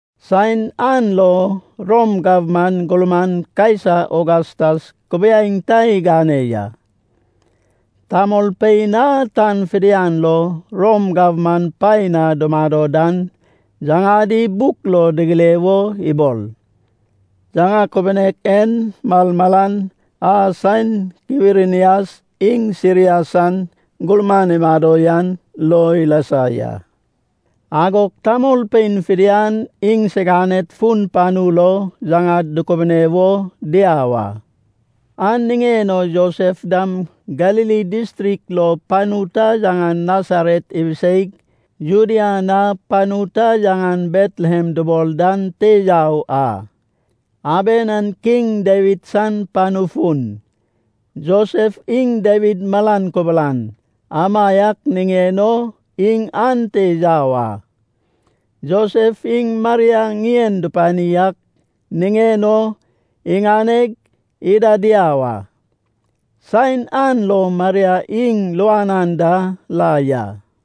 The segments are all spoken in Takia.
Saen an lo Rom gabman gurman Kaisa Ogastas kubiaeŋ ta igane ya. Tamolpein a tan fidian lo Rom gabman paen na dumado dan, yaŋadi buk lo digire wo ibol. (Yaŋa kubunek en malmalan a, saen Kwirinias iŋ Siria san gurman imado yan lo ilasa ya.) Agog tamolpein fidian iŋsiganed fun panu lo yaŋad dukubune wo diau a. An niŋen o Josef dam Galili distrik lo panu ta yaŋan Nasaret ibiseig, Judea na panu ta yaŋan Betlehem dubol dan te yau a. Aben an Kiŋ Dawid san panu fun. Josef iŋ Dawid malan kubulan, amaiak niŋen o iŋ ante yau a. Josef iŋ Maria ŋien dupani ak niŋen o iŋaneg ida diau a. Saen an lo Maria iŋ luan anda la ya.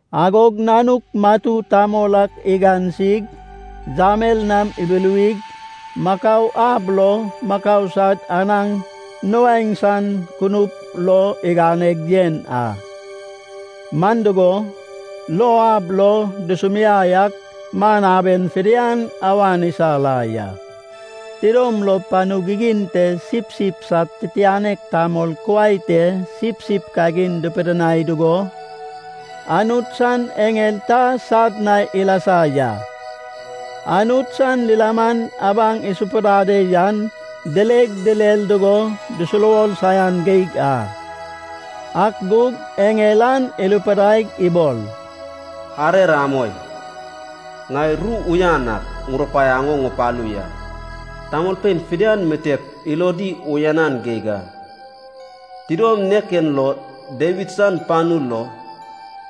Agog nanuk matu tamol ak igansig, yamel nam ibuluwig, makau ab lo makau sad anaŋ nuaeŋ san kunup lo iganeg yen a. Man dugo, lou ab lo dusumiai ak man aben fidian awan isa la ya. Tidom lo panu gigin te sipsip sad titianek tamol kuai te sipsip kagin dupidinai dugo, Anut san eŋel ta sad na ilasa ya. Anut san lilaman abaŋ isapudade yan dileg direr dugo dusuruwor saian geig a. Ak gug eŋel an irupidaig ibol, “Arer amoi. Ŋai ru uyan ak ŋurupaiaŋ o ŋupalu ya. Tamolpein fidian mitep ilodi uyanan geig a. Tidom nek en lo Dawid san panu lo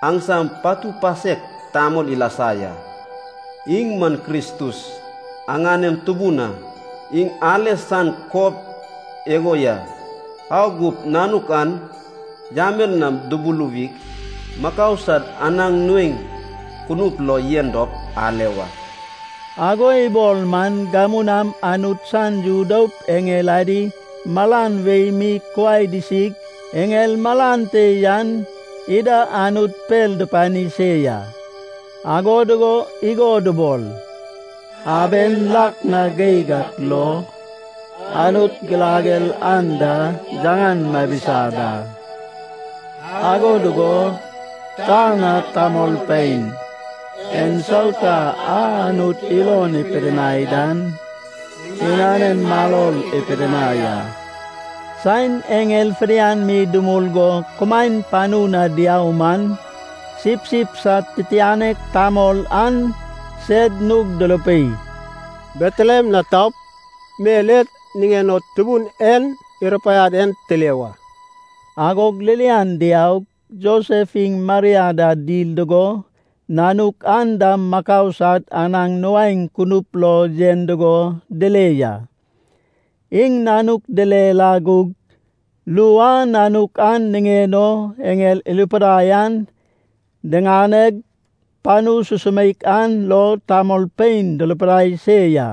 aŋsam patu pasek tamol ilasa ya. Iŋ man Kristus, aŋanem Tubun a. Iŋ ale san kob igo ya, au gup nanuk an yamel nam dubuluwig, makau sad anaŋ nuaeŋ kunup lo yen dop ale wa.” Ago ibol man, gamu nam Anut san yu doup eŋel adi malan wei mi kuai disig, eŋel malan te yan ida Anut per dupani se ya. Ago dugo igo dubol, “Aben lak na geig ak lo, Anut girager anda yaŋan mabisa da. Ago dugo tan na, tamolpein ensauta a Anut ilon ipidinai dan, iŋanen maror ipidinai a.” Saen eŋel fidian mi dumul go kumaen panu na diau man, sipsip sad titianek tamol an sed nug durupei, “Betlehem na taup, mel e niŋen o Tubun en irupaiad en tile wa.” Agog ririan diaug, Josef iŋ Maria da dil dugo, nanuk an dam makau sad anaŋ nuaeŋ kunup lo yen dugo dile ya. Iŋ nanuk dile la gug, ru a nanuk an niŋen o eŋel irupidai an diŋaneg panu susumeik an lo tamolpein durupidai se ya.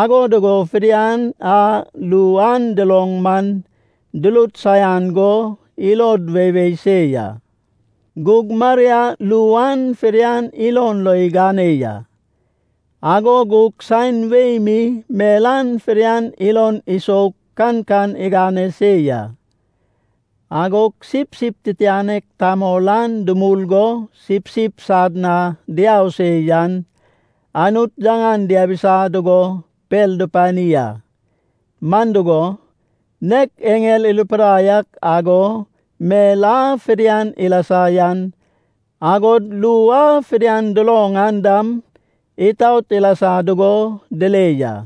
Ago dugo fidian a ru an duloŋ man, durut saian go ilod weiwei se ya. Gug Maria ru an fidian ilon lo igane ya, ago gug saen wei mi mel an fidian ilon isoug kankan igane se ya. Agog sipsip titianek tamol an dumul go sipsip sad na diau se yan, Anut yaŋan diabisa dugo per dupani a. Man dugo, nek eŋel irupidai ak ago, mel a fidian ilasa yan, agod ru a fidian duloŋ an dam, itaot ilasa dugo dile ya.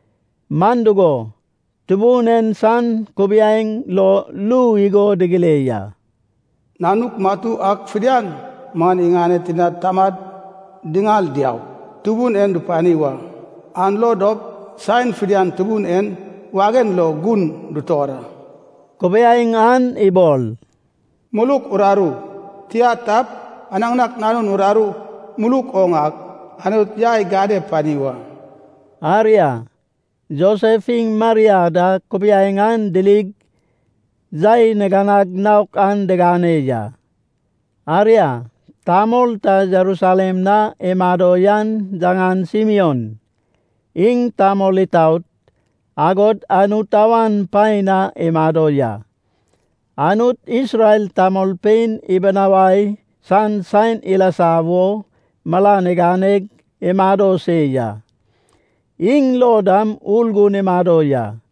Man dugo, Tubun en san kubiaeŋ lo ru igo digire ya, “Nanuk matu ak fidian man iŋaned tinad tamad diŋal diaup Tubun en dupani wa, an lo dop saen fidian Tubun en wagen lo gun dutor a.” Kubiaeŋ an ibol, “muluk uraru, tia tap, anakanak nanun uraru muluk oŋ ak Anut yai gane pani wa.” Aria, Josef iŋ Maria da kubiaeŋ an dirig yai niganag naok an digane ya. Aria, tamol ta Jerusalem na imado yan yaŋan Simion. Iŋ tamol itaot, agod Anut awan paen na imado ya. Anut Isrel tamolpein ibinawai san saen ilasa wo, malan iganeg imado se ya. Iŋ lo dam Urgun imado ya.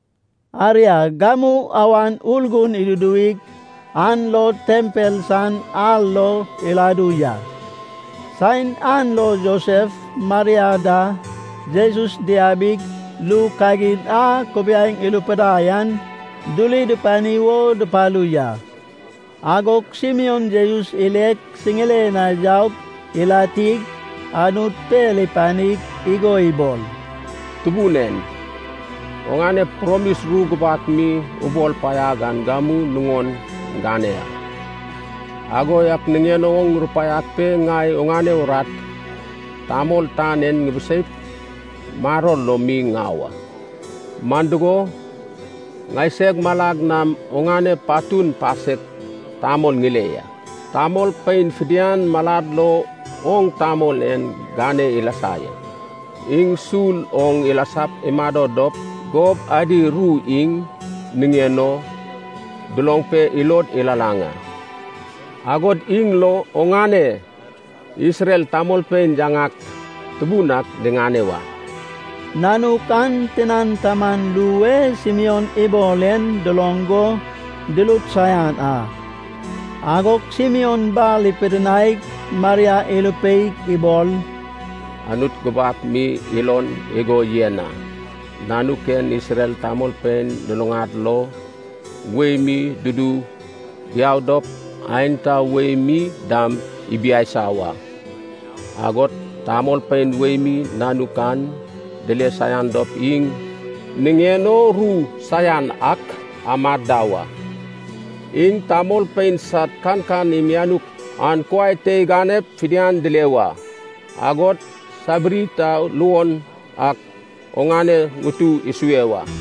Aria, gamu Awan Urgun iduduwig an lo tempel san ar lo iladu ya. Saen an lo Josef, Maria da Jesus diabig ru kagin a kubiaeŋ irupidai an duri dupani wo dupalu ya. Agog Simion Jesus ileg siŋiren na yaug ilatig Anut per ipanig igo ibol, “Tubun en, oŋane promis ru gubak mi ubol paiag an gamu nuŋon gane ya. Ago yak niŋen o rupaiag pe ŋai oŋane urat tamol tan en ŋibiseip, maror lo mi ŋau a. Man dugo, ŋaiseg malag nam oŋane patun pasek tamol ŋile ya. Tamolpein fidian malad lo oŋ tamol en gane ilasa ya. Iŋ sul oŋ ilasap imado dop gob adi ru iŋ niŋen o duloŋ pe ilod ilalaŋ a, agod iŋ lo oŋane Isrel tamolpein yaŋak tubun ak diŋane wa.” Nanuk an tinan taman ru e Simion ibol en duloŋ go durut saian a. Agog Simion bar ipidinaig Maria irupeig ibol, “Anut gubak mi ilon igo yen a, nanuk en Isrel tamolpein luluŋad lo, wei mi dudu diau dop, aenta wei mi dam ibiaisa wa. Agod tamolpein wei mi nanuk an dile saian dop iŋ niŋen o ru saian ak amad da wa. Iŋ tamolpein sad kankan imianuk an kuai te iganep fidian dile wa. Agod sabiri ta luon ak oŋane ŋutu isue wa.”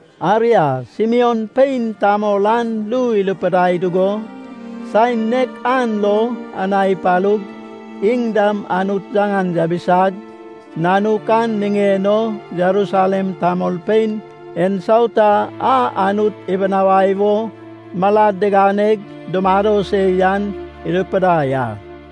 Aria, Simion pein tamol an ru irupidai dugo, saen nek an lo Ana ipalug, iŋ dam Anut yaŋan yabisag, nanuk an niŋen o Jerusalem tamolpein ensauta a Anut ibinawai o malad diganeg dumado se yan irupidai a.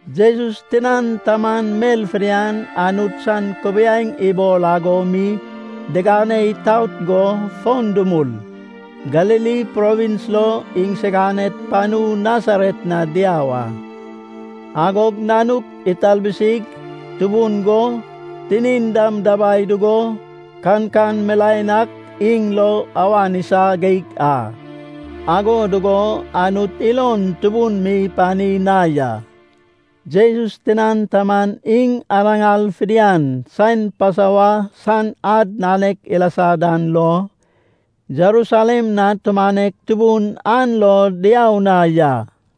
Jesus tinan taman mel fidian Anut san kubiaeŋ ibol ago mi digane itout go fon dumul, Galili provins lo iŋsiganed panu Nasaret na diau a. Agog nanuk italbusig tubun go, tinin dam dabai dugo kankan milaen ak iŋ lo awan isa geig a. Ago dugo Anut ilon tubun mi ipani na ya. Jesus tinan taman iŋ anaŋar fidian, saen Pasova san ad nanek ilasa dan lo, Jerusalem na tumanek tubun an lo diau na ya.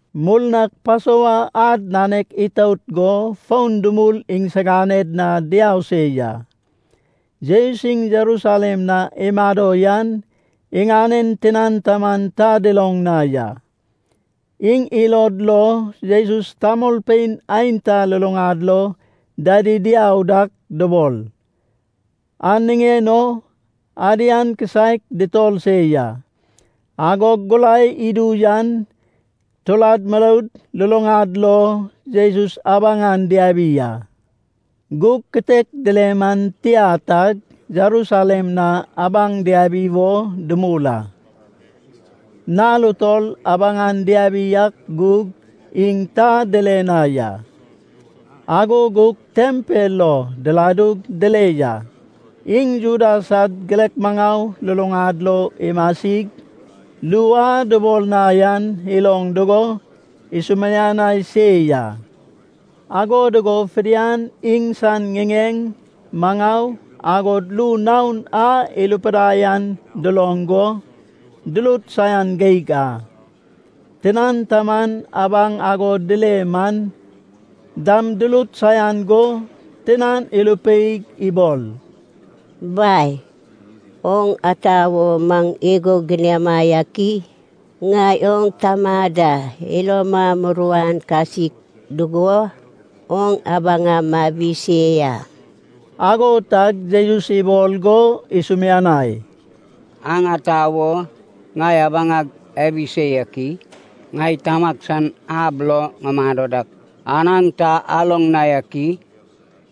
Murnag Pasova ad nanek itout go fon dumul iŋsiganed na diau se ya. Jesus iŋ Jerusalem na imado yan, iŋanen tinan taman ta duloŋ na ya. Iŋ ilod lo Jesus tamolpein aenta luluŋad lo dadi diau dak dubol. An niŋen o adian kisaek dutor se ya. Agog gurai idu yan, turad muroud luluŋad lo Jesus abaŋan diabi a. Gug kitek dile man tia tag Jerusalem na abaŋ diabi wo dumul a. Nal utol abaŋan diabi ak gug, iŋ ta dile na ya. Ago gug tempel lo diladug dile ya. Iŋ Juda sad girek maŋau luluŋad lo imasig, ru a dubol na yan iloŋ dugo, isumianai se ya. Ago dugo fidian iŋsan ŋiŋeŋ, maŋau, agod ru naon a irupidai an duloŋ go, durut saian geig a. Tinan taman abaŋ ago dile man dam durut saian go tinan irupeig ibol, “Bai, oŋ ata wo maŋ igo giniama yak i? Ŋai oŋ tama da iloma muruan kasik dugo, oŋ abaŋa mabi se ya.” Ago tag Jesus ibol go isumianai, “Aŋ ata wo ŋai abaŋag abi se yak i? Ŋai tamag san ab lo ŋumado dak, an aŋ ta aloŋ na yak i?”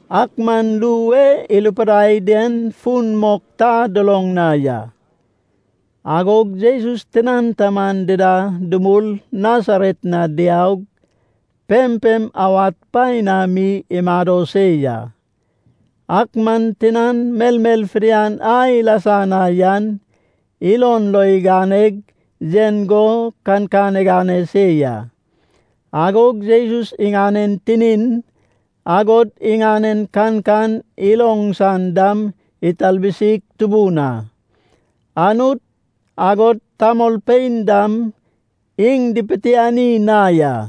Ak man ru e irupidai den fun mok ta duloŋ na ya. Agog Jesus tinan taman dida dumul Nasaret na diaug, pempem awad paen na mi imado se ya. Ak man tinan melmel fidian a ilasa na yan, ilon lo iganeg yen go kankan igane se ya. Agog Jesus iŋanen tinin, agod iŋanen kankan iloŋ san dam italbusig tubun a. Anut, agod tamolpein dam iŋ dipitiani na ya.